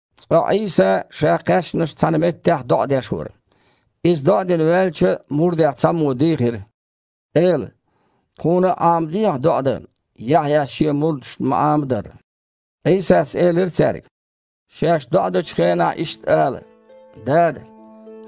Цкъа Іийса Ша кхаьчначу цхьана меттехь доІа деш вара. Иза доІа дина ваьлча, мурдех цхьаммо дийхира: «Эла! Тхуна а Іамадехьа доІа дан, Яхьъяс шен мурдашна ма-Іамадарра». Іийсас элира цаьрга: «Шаьш доІа дечу хенахь иштта ала: „Дада!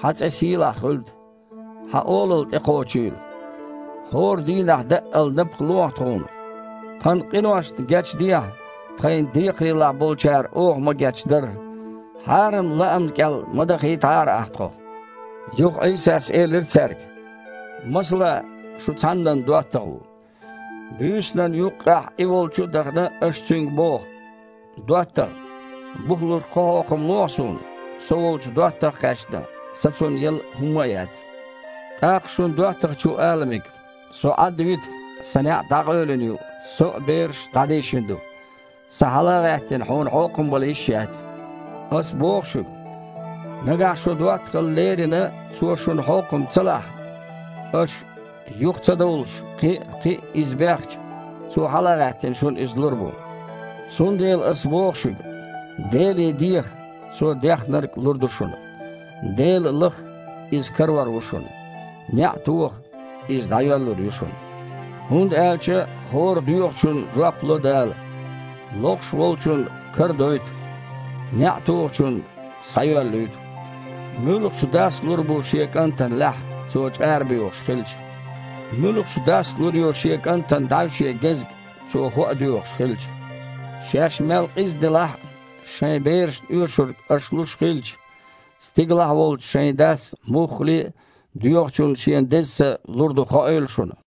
Хьан цІе сийлахь хуьлда! Хьан Олалла тІекхочийла! ХІора дийнахь даъал напха лохьа тхуна. Тхан къиношна гечдехьа, тхайна декхарийлахь болчарна оха ма-гечдарра. Хьарам лаамна кІел ма дахийтахьара Ахьа тхо“». Юха Іийсас элира цаьрга: «Масала, шун цхьаннан доттагІа ву. Буьйсанан юккъехь и волчу а дахана, аш цуьнга боху: „ДоттагІа! Бухалург кхо хьокхам лохьа суна, со волчу доттагІа кхаьчна, сан цунна яла хІумма а яц“. ТІаккха шун доттагІчо ала мега: „Со Іадда вита, сан неІ дІакъевлина ю, со а, бераш а дІадийшина ду. Сан, хьала а гІаьттина, хьуна хьокхам бала йиш яц“. Ас боху шуьга, нагахь шун доттагІалла лерина цо шуна хьокхам ца лахь, аш, юха ца довлуш, кхин а, кхин а иза бехча, цо, хьала а гІаьттина, шуна иза лур бу. Цундела Ас боху шуьга: „Деле деха – Цо дехнарг лур ду шуна. Дела лаха – Иза карор ву шуна, неІ тоха, иза дІайоьллур ю шуна, хІунда аьлча хІора доьхучунна жоп ло Дала, лохуш волчунна карадойту, неІ тухучунна – схьайоьллуьйту. Муьлхачу дас лур бу шен кІантана лаьхьа, цо чІара боьхуш хилча? Муьлхачу дас лур ю шен кІантана дІаьвше гезг, цо хІоа доьхуш хилча? Шаьш мел къиза делахь а, шайн берашна оьшург аша луш хилча, стигалахь волчу шайн Дас муххале а доьхучунна Шен Деза Са лур дуйла хоуьйла шуна“».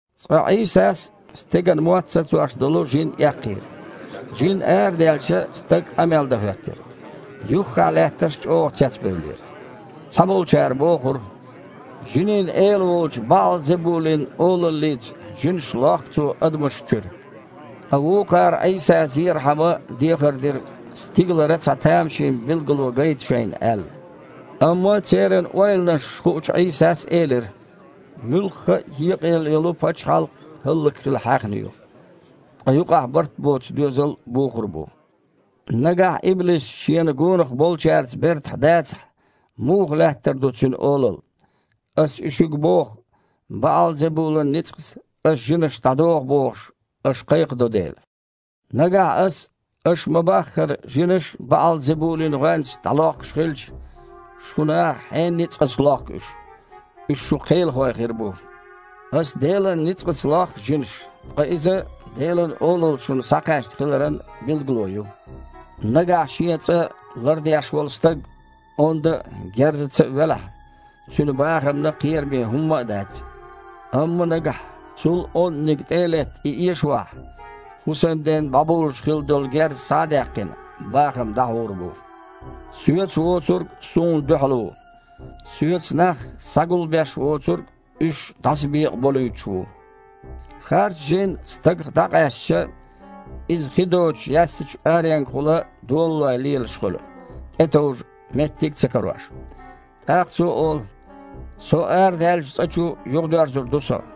Цкъа Іийсас стеган мотт сацош долу жин эккхийра. Жин арадаьлча, стаг къамел дан хІоьттира. Юххехь лаьттарш чІогІа цецбевллера. Цхьаболчара бохура: «Жинийн эла волчу БаІал-Зебулин олаллица жинаш лохку Цо адамашна чуьра». Ткъа вукхара Іийса зерхьама дехар дира, стигалара цхьа тамашийна билгало гайта шайна аьлла. Амма церан ойланаш хуучу Іийсас элира: «Муьлхха а екъаелла йолу пачхьалкх хІаллакьхила хьаьхна ю. Ткъа юкъахь барт боцу доьзал бухур бу. Нагахь иблис шена гонах болчаьрца бертахь дацахь, муха лаьттар ду цуьнан олалла? Ас и шуьга боху, БаІал-Зебулан ницкъаца Ас жинаш дІадоху бохуш, аш кхайкхадо дела. Нагахь Ас, аша ма-баххара, жинаш БаІал-Зебулин гІоьнца дІалохкуш хилча, шун наха хьенан ницкъаца лохку уьш? Уьш шун кхелахой хир бу! Ас Делан ницкъаца лохку жинаш, ткъа иза Делан Олалла шуна схьакхаьчна хиларан билгало ю. Нагахь шен цІа лардеш волу стаг онда а, герзаца а велахь, цуьнан бахамна кхераме хІумма а дац. Амма нагахь, цул онданиг тІе а летта, и эшавахь, хІусамден бІобулуш хилла долу герз схьа а даьккхина, бахам дІахьур бу. Соьца воцург Суна дуьхьал ву. Соьца нах схьагулбеш воцург уьш дІасабекъаболуьйтуш ву». «Харцжин стагах дІакъаьстича, иза хи доцучу яьссачу аренгахула долалой лелаш хуьлу, тІетовжа меттиг а ца карош. ТІаккха цо олу: „Со арадаьллачу цІа чу юхадоьрзур ду со“.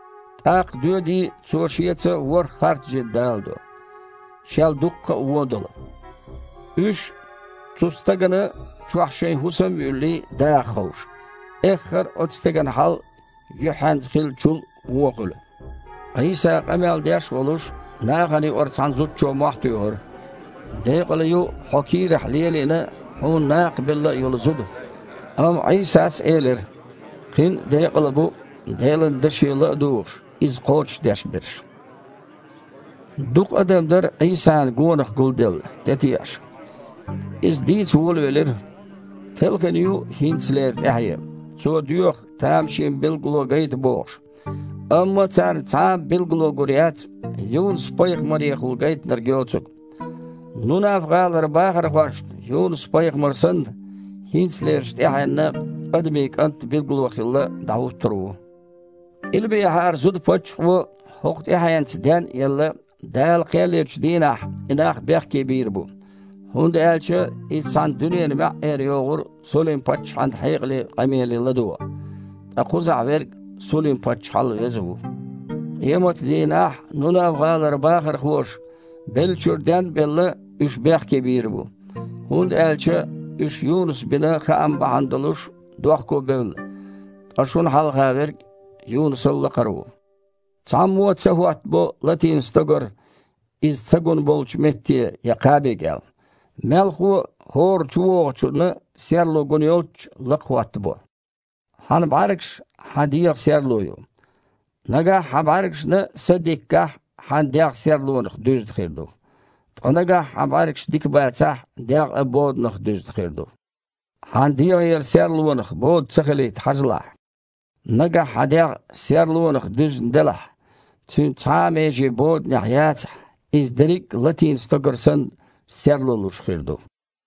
ТІаккха доьдий, цо шеца ворхІ харцжин даладо, шел дуккха а вон долу. Уьш, цу стагана чохь шайн хІусам а юьллий, даха ховшу. Эххар а оцу стеган хьал юьххьенца хиллачул а вон хуьлу». Іийса къамел деш а волуш, нахана юкъара цхьана зудчо мохь туьйхира: «Декъала ю Хьо кийрахь лелийна а, Хьуна накха белла а йолу зуда!» Амма Іийсас элира: «Кхин а декъала бу, Делан даше ла а дугІуш, иза кхочушдеш берш». Дукха адам дара Іийсана гонах гулделла, тІетеІаш. Иза дийца волавелира: «Телхина ю хІинцалера тІаьхье. Цо доьху тамашийна билгало гайта бохуш, амма царна цхьа а билгало гур яц, Юнус-пайхамарехула гайтинарг йоцург. Нунав-гІалара бахархошна Юнус-пайхамар санна, хІинцалерчу тІаьхьенна Адамийн КІант а билгало хилла дІахІуттур ву. Къилбехьарчу зуда-паччахьо, хІокху тІаьхьенца ден а елла, Дала кхел ечу дийнахь и нах бехке бийр бу, хІунда аьлча иза цхьана дуьненан маьІІера йогІура Сулим-паччахьан хьекъале къамеле ладогІа. Ткъа кхузахь Верг Сулим-паччахьал веза ву. Къематан дийнахь Нунав-гІалара бахархоша, беллачуьра ден а белла, уьш бехке бийр бу, хІунда аьлча уьш Юнуса бина хаам бахьана долуш дохкобевлла, ткъа шуна хьалха Верг Юнусал лакхара ву». «Цхьаммо а ца хІоттабо латийна стогар иза ца гунболчу метте я кхаби кІел. Мелхо а хІора чувогІучунна серло гун йолччу лакха хІоттабо. Хьан бІаьргаш – хьан дегІан серло ю. Нагахь хьан бІаьргашна са дика гахь, хьан дегІ серлонах дуьзна хир ду. Ткъа нагахь хьан бІаьргаш дика бацахь, дегІ а боданах дуьзна хир ду. Хьайн дегІера серлонах бода ца хилийта хьажалахь. Нагахь хьан дегІ серлонах дуьзна делахь, цуьнан цхьа а меже боданехь яцахь, иза дерриг а, латийна стогар санна, серло луш хир ду».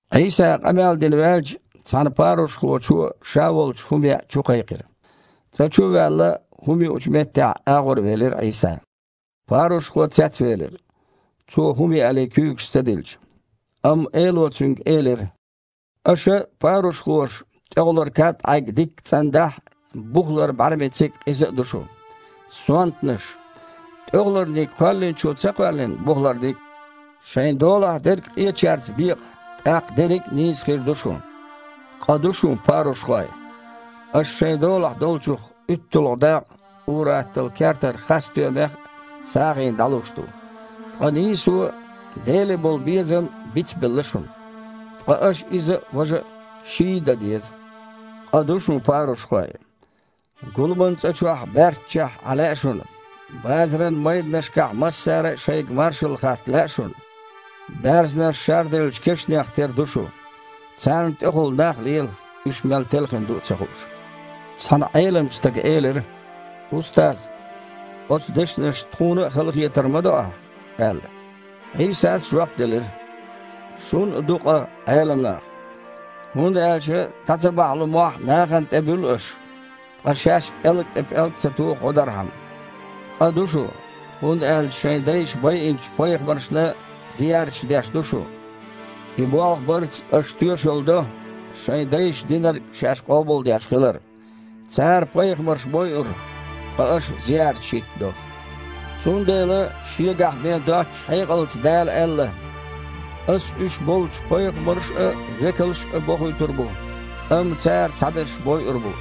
Іийса, къамел дина ваьлча, цхьана парушхочо ша волчу хІума яа чукхайкхира. ЦІа чу а ваьлла, хІума юучу меттехь агІорвелира Іийса. Парушхо цецвелира, Цо хІума яале куьйгаш ца дилча. Амма Эло цуьнга элира: «Аша, парушхоша, тІехулара кад-Іайг дикка цІандахь а, бухалара бІаьрмециг а, къиза а ду шу. Сонтанаш! ТІехуларниг Кхоьллинчо ца кхоьллина бухаларниг а? Шайн долахь дерг къечаьрца декъа, тІаккха дерриг а нийса хир ду шун. Къа ду шун, парушхой! Аша шайн долахь долчух уьтталгІа дакъа, ур-атталла кертара хас-стоьмех а, сагІина дІалуш ду, ткъа нийсо а, Деле болу безам а бицбелла шуна. Ткъа аш иза а, важа а – ший а дан деза. Къа ду шун, парушхой! Гуламан цІа чохь баьрччехь Іан лаьа шуна, базаран майданашкахь массара а шайга маршалла хатта лаьа шуна. Баьрзнаш шарделлачу кешнех тера ду шу. Царна тІехула нах лела, уьш мел телхина ду а ца хууш». Цхьана Іеламчу стага элира: «Устаз! Оцу дешнашца тхуна а халахетар ма до Ахь!» – аьлла. Іийсас жоп делира: «Шун а ду къа, Іелам нах! ХІунда аьлча дІа ца бахьлун мохь нахана тІе буьллу аш, ткъа шаьш пІелга тІе пІелг а ца туху гІодархьама. Къа ду шун, хІунда аьлча шайн дайша байинчу пайхамаршна зиярташ деш ду шу. И болх барца аш тоьшалла до, шайн дайша динарг шаьш къобалдеш хилар: цара пайхамарш бойура, ткъа аш зиярташ хІиттадо. Цундела Шегахь бен доцучу хьекъалца Дала аьлла: „Ас уьш болчу пайхамарш а, векалш а бохуьйтур бу, амма цара цхьаберш бойур бу,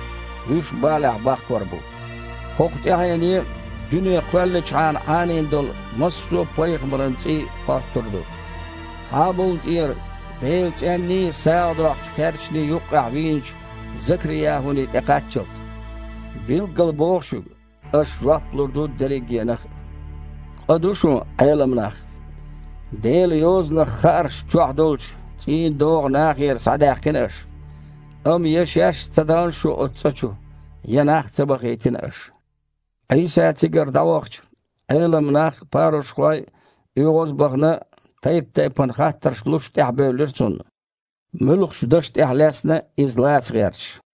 вуьш балехь бахкор бу“. ХІокху тІаьхьене дуьне кхоьллинчхьана Іанийна долу массо а пайхамаран цІий хоттур ду: Хьабулна тІера Делан цІенний, сагІа доккхучу кхерчаний юккъехь вийначу Закри-ЯхІуний тІе кхаччалц. Билггала боху шуьга, аш жоп лур ду дериггенах а. Къа ду шун, Іелам нах! Делан Йозанах хаарш чохь долчу цІийнан догІа нахера схьадаьккхина аш. Амма я шаьш а ца дахана шу оцу цІа чу, я нах а ца бахийтина аш». Іийса цигара дІавахча, Іелам нах а, парушхой а, оьгІаз а бахана, тайп-тайпана хаттарш луш тІаьхьабевлира Цунна, муьлххачу даша тІехь лаьцна а, Иза лаца гІерташ.